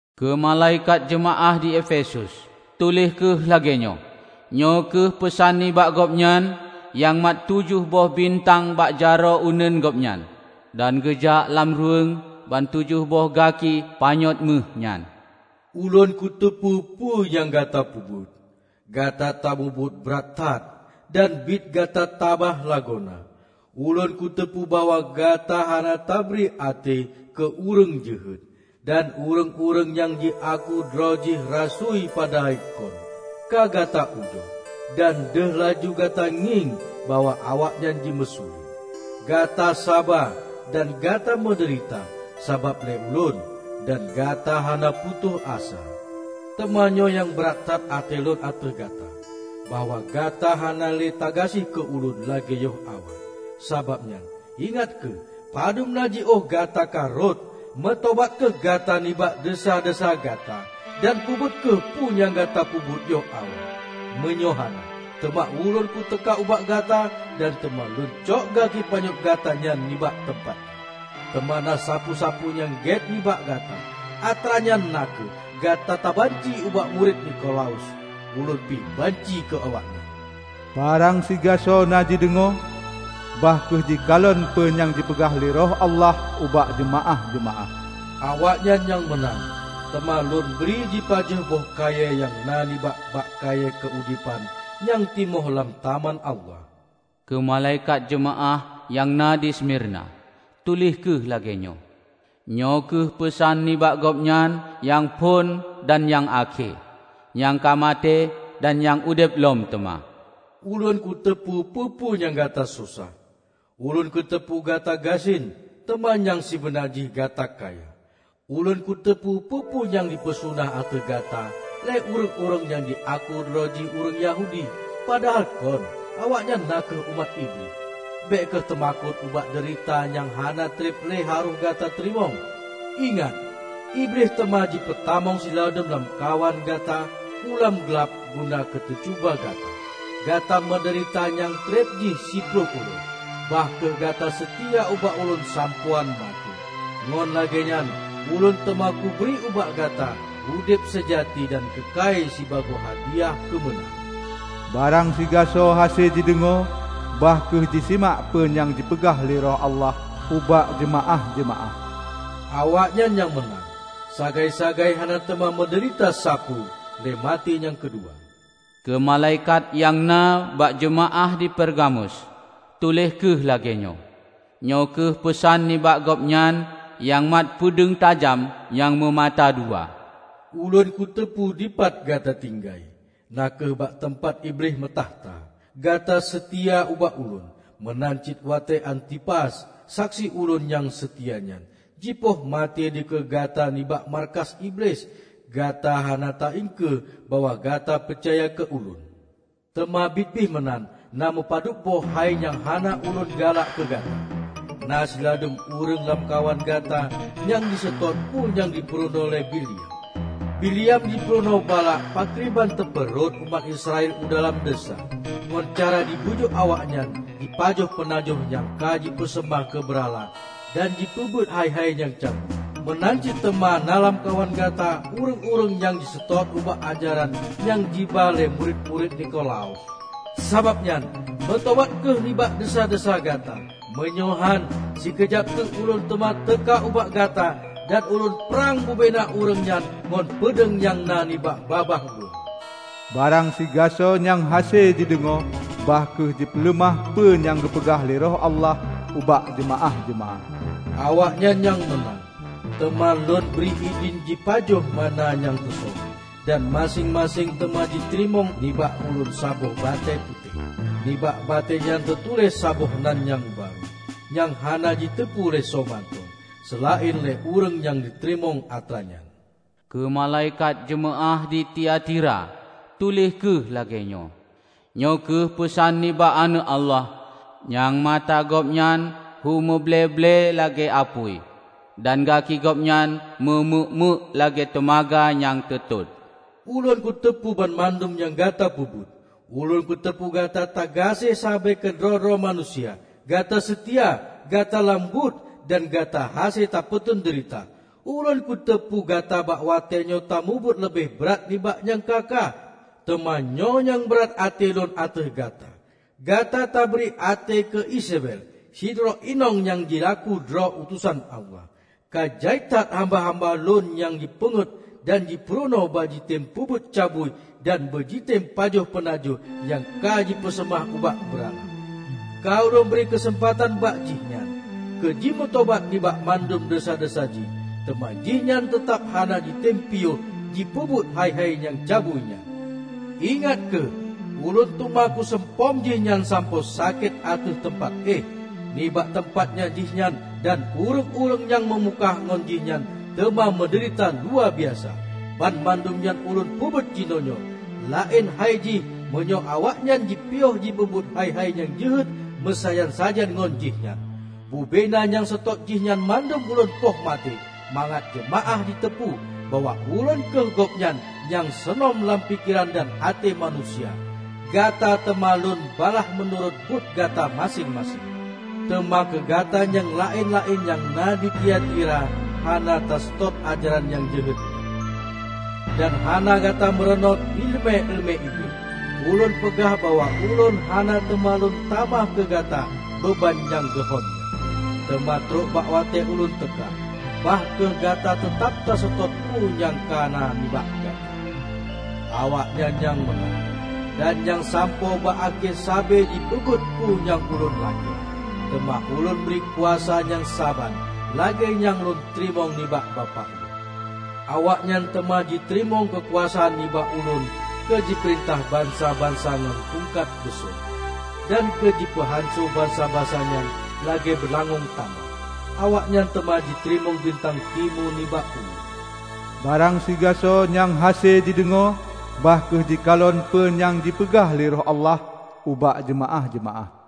"Keu malaikat jeumaáh di Efesus, tuléh kheueh lagée nyoe: Nyoe kheueh peusan nibak Gobnyan nyang mat tujoh boh bintang bak jaroe uneuen Gobnyan, dan geujak lam ruweueng ban tujoh boh gaki panyöt méuh nyan. Ulôn kuteupeue peue nyang gata peubuet: Gata tamubuet brat that dan biet gata tabah lagoena. Ulôn kuteupeue bahwa gata hana tabri até keu ureuëng jeuhet. Dan ureuëng-ureuëng nyang jiaku droe jih rasui padahai kon, ka gata ujoe, dan deuh laju gata ngieng bahwa awaknyan jimeusulet. Gata saba dan gata meudeurita sabab lé Ulôn, dan gata hana putôh asa. Teuma nyoe nyang brat that até Lôn ateueh gata: Bahwa gata hana lé tagaséh keu Ulôn lagée yoh awai. Sabab nyan, ingat kheueh padub na jiôh gata ka rhot! Meutobat kheueh gata nibak desya-desya gata, dan peubuet kheueh peue nyang gata peubuet yoh awai. Meunyoe hana, teuma Ulôn kuteuka ubak gata dan teuma Lôn cok gaki panyöt gata nyan nibak teumpat jih. Teuma na sapeue-sapeue nyang gét nibak gata, atra nyan na kheueh: Gata tabanci ubak murit Nikolaus, Ulôn pih banci keu awaknyan. Barang sigasoe na jideungoe, bah kheueh jikalon peue nyang jipeugah lé Roh Allah ubak jeumaáh-jeumaáh! Awaknyan nyang meunang, teuma Lôn bri jipajoh boh kayée nyang na nibak bak-kayée keuudeban nyang timoh lam Taman Allah." "Keu malaikat jeumaáh nyang na di Smirna, tuléh kheueh lagée nyoe: Nyoe kheueh peusan nibak Gobnyan nyang phon dan nyang akhé -- nyang ka maté dan nyang udeb lom teuma. Ulôn kuteupeue peue-peue nyang gata susah; Ulôn kuteupeue gata gasien teuma nyang sibeuna jih gata kaya! Ulôn kuteupeue peue-peue nyang jipeusuna ateueh gata lé ureuëng-ureuëng nyang jiaku droe jih ureuëng Yahudi, padahai kon; awaknyan na kheueh umat Iblih! Bék kheueh teumakot ubak deurita nyang hana treb lé harôh gata teurimong. Ingat, Iblih teuma jipeutamong siladum lamkawan gata u lam glab guna keuteucuba gata. Gata meudeurita nyang treb jih siploh uroe. Bah kheueh gata seutia ubak Ulôn sampoe án maté, ngon lagée nyan Ulôn teuma kubri ubak gata udeb seujati dan keukai sibagoe hadiah keumeunang. Barang sigasoe hase jideungoe, bah kheueh jisimak peue nyang jipeugah lé Roh Allah ubak jeumaáh-jeumaáh! Awaknyan nyang meunang, sagai-sagai hana teuma meudeurita sapeue lé maté nyang keudua." "Keu malaikat nyang na bak jeumaáh di Pergamus, tuléh kheueh lagée nyoe: Nyoe kheueh peusan nibak Gobnyan nyang mat peudeueng tajam nyang meumata dua. Ulôn kuteupeue dipat gata tinggai, na kheueh bak teumpat Iblih meutakhta. Gata seutia ubak Ulôn. Meunan cit watée Antipas, saksi Ulôn nyang seutia nyan, jipoh maté dikeue gata nibak markas Iblih, gata hana taiengkeue bahwa gata peucaya keu Ulôn. Teuma biet pih meunan na meupadubboh hai nyang hana Ulôn galak keu gata: Na siladum ureuëng lamkawan gata nyang jiseutôt peue nyang jipeurunoe lé Bileam. Bileam jipurunoe Balak pakriban teupeu rhot umat Israel u dalam desya; ngon cara jibujuk awaknyan jipajoh peunajoh nyang ka jipeuseumah keu beurala dan jipeubuet hai-hai nyang cabui. Meunan cit teuma na lamkawan gata ureuëng-ureuëng nyang jiseutôt ubak ajaran nyang jiba lé murit-murit Nikolaus. Sabab nyan, meutobat kheueh nibak desya-desya gata! Meunyoe hán, sikeujab teuk Ulôn teuma teuka ubak gata dan Ulôn prang bubena ureuëng nyan ngon peudeueng nyang na nibak babah Lôn. Barang sigasoe nyang hase jideungoe, bah kheueh jipeuleumah peue nyang geupeugah lé Roh Allah ubak jeumaáh-jeumaáh! Awaknyan nyang meunang, teuma Lôn bri idhin jipajoh manna nyang teusöm, dan maséng-maséng teuma jiteurimong nibak Ulôn saboh batée putéh. Nibak batée nyan teutuléh saboh nan nyang barô, nyang hana jiteupeue lé soe mantong, seulaén lé ureuëng nyang teurimong atra nyan." "Keu malaikat jeumaáh di Tiatira, tuléh kheueh lagée nyoe: Nyoe kheueh peusan nibak Aneuëk Allah, nyang mata Gobnyan hu muble-ble lagée apui, dan gaki Gobnyan meu meuk-meuk lagée teumaga nyang teutot. Ulôn kuteupeue banmandum nyang gata peubuet -- Ulôn kuteupeue gata tagaséh sabe keudroe-droe manusia, gata seutia, gata lam buet, dan gata hase tapeuteun deurita. Ulôn kuteupeue gata bak watée nyoe tamubuet leubeh brat nibak nyang ka-ka. Teuma nyoe nyang brat até Lôn ateueh gata: Gata tabri até keu Izebel, sidroe inong nyang jiaku droe utosan Allah. Ka jai that hamba-hamba Lôn nyang jipeungét dan jipurunoe beujitem peubuet cabui dan beujitem pajoh peunajoh nyang ka jipeuseumah ubak beurala. Ka Ulôn bri keuseumpatan bak jih nyan keu jimeutobat nibak mandum desya-desya jih, teuma jihnyan teutab hana jitem piôh jipeubuet hai-hai nyang cabui nyan. Ingat kheueh! Ulôn teuma kuseumpom jihnyan sampoe sakét ateueh teumpat éh. Nibak teumpat nyan jihnyan dan ureuëng-ureuëng nyang meumukah ngon jihnyan teuma meudeurita luwabiasa. Banmandum nyan Ulôn peubuet jinoenyoe -- laén hai jih meunyoe awaknyan jipiôh jipeubuet hai-hai nyang jeuhet meusajan-sajan ngon jihnyan. Bubena nyang seutôt jihnyan mandum Lôn poh maté mangat jeumaáh jiteupeue bahwa Ulôn kheueh Gobnyan nyang seunom lam pikeran dan até manusia. Gata teuma Lôn balaih meunurot buet gata maséng-maséng. Teuma keu gata nyang laén-laén nyang na di Tiatira hana taseutôt ajaran nyang jeuhet nyan, dan hana gata meurunoe iéleumé-iéleumé Iblih. Ulôn peugah bahwa Ulôn hana teuma Lôn tamah keu gata beuban nyang geuhon nyan. Teuma trok bak watée Ulôn teuka, bah kheueh gata teutab taseutôt peue nyang ka na nibak gata. Awaknyan nyang meunang, dan nyang sampoe bak akhé sabe jipeubuet peue nyang Ulôn lakée, teuma Ulôn bri kuasa nyang saban lagée nyang Lôn teurimong nibak Bapak Lôn. Awaknyan teuma jiteurimong keukuasaan nibak Ulôn keu jipeurintah bansa-bansa ngon tungkat beuso, dan keu jipeuhanco bansa-bansa nyan lagée beulangöng tanoh. Awaknyan teuma jiteurimong bintang timu nibak Ulôn. Barang sigasoe nyang hase jideungoe, bah kheueh jikalon peue nyang jipeugah lé Roh Allah ubak jeumaáh-jeumaáh!"